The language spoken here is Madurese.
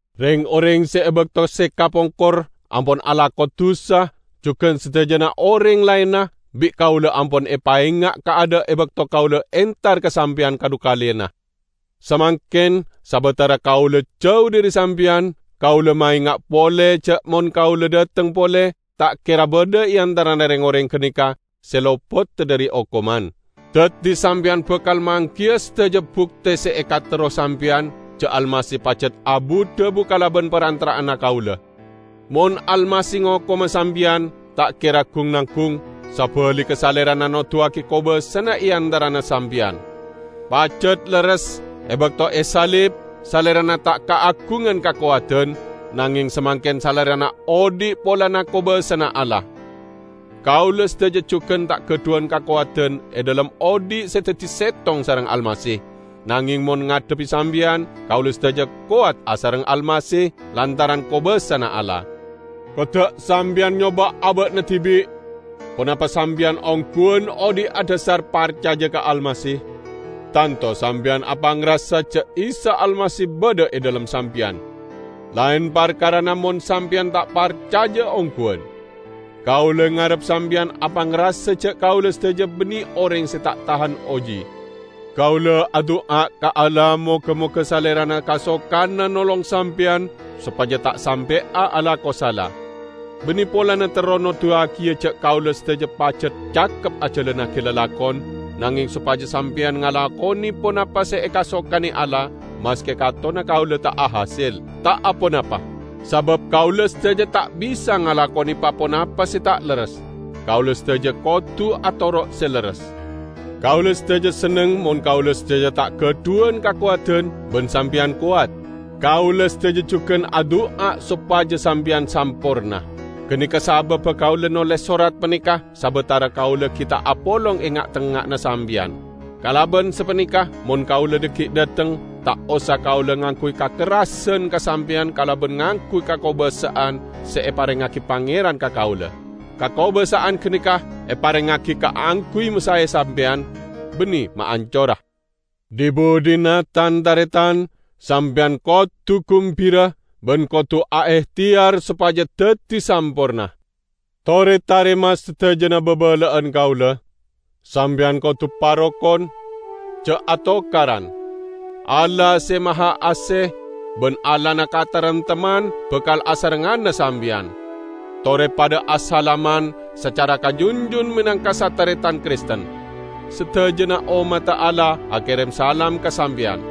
Reng-oreng se e bakto se kapongkor ampon alako dusa, jugan sadajana oreng laenna, bi' kaula ampon epaenga' kaadha' e bakto kaula entar ka sampeyan kadhukaleyanna. Samangken, sabatara kaula jau dhari sampeyan, kaula maenga' pole ja' mon kaula dhateng pole, ta' kera badha e antarana reng-oreng ganeka se lopoda dhari okoman. Daddi sampeyan bakal manggiya sadaja bukte se ekaterro sampeyan ja' Almasih pajat abu-dhabu kalaban parantara'anna kaula. Mon Almasih ngokoma sampeyan, ta' kera gung-nanggung, sabaligga Salerana noduwagi kobasana e antarana sampeyan. Pajat lerres, e bakto esalib, Salerana ta' kaagungan kakowadan, nangeng samangken Salerana odhi' polana kobasana Allah. Kaula sadaja jugan ta' gadhuwan kakowadan e dhalem odhi' se daddi settong sareng Almasih, nangeng mon ngadhebbi sampeyan, kaula sadaja kowat asareng Almasih lantaran kobasana Allah. Kodda' sampeyan nyoba' aba'na dibi' ponapa sampeyan ongguwan odhi' adhasar parcaja ka Almasih! Tanto sampeyan apangrasa ja' Isa Almasih badha e dhalem sampeyan! -- laen parkarana mon sampeyan ta' parcaja ongguwan. Kaula ngarep sampeyan apangrasa ja' kaula sadaja banne oreng se ta' tahan oji. Kaula adu'a ka Allah moga-moga Salerana kasokana nolong sampeyan sopaja ta' sampe'a alako sala. Banne polana terro noduwagiya ja' kaula sadaja pajat cakep ajalannagi lalakon, nangeng sopaja sampeyan ngalakone ponapa se ekasokane Allah -- maske katonna kaula ta' ahasel, ta' aponapa! Sabab kaula sadaja ta' bisa ngalakone pa-ponapa se ta' lerres; kaula sadaja kodu atoro' se lerres. Kaula sadaja senneng mon kaula sadaja ta' gadhuwan kakowadan, ban sampeyan kowat. Kaula sadaja jugan adu'a sopaja sampeyan samporna. Ganeka sababba kaula noles sorat paneka sabatara kaula gi' ta' apolong e nga'tengnga'anna sampeyan. Kalaban sapaneka, mon kaula dhaggi' dhateng, ta' osa kaula ngangguy kakerrasan ka sampeyan kalaban ngangguy kakobasa'an se eparengngagi Pangeran ka kaula. Kakobasa'an ganeka eparengngagi kaangguy masae sampeyan, banne maancora. Dhi-budhina, tan-taretan, sampeyan kodu gumbira, ban kodu aehteyar sopaja daddi samporna. Tore tarema sadajana babala'an kaula. Sampeyan kodu parokon, ja' atokaran. Allah Se Mahaase ban Allahna kataremtemman bakal asarengngana sampeyan. Tore padha asalaman sacara kajunjun menangka sataretan Kristen. Sadajana ommadda Allah akerem salam ka sampeyan.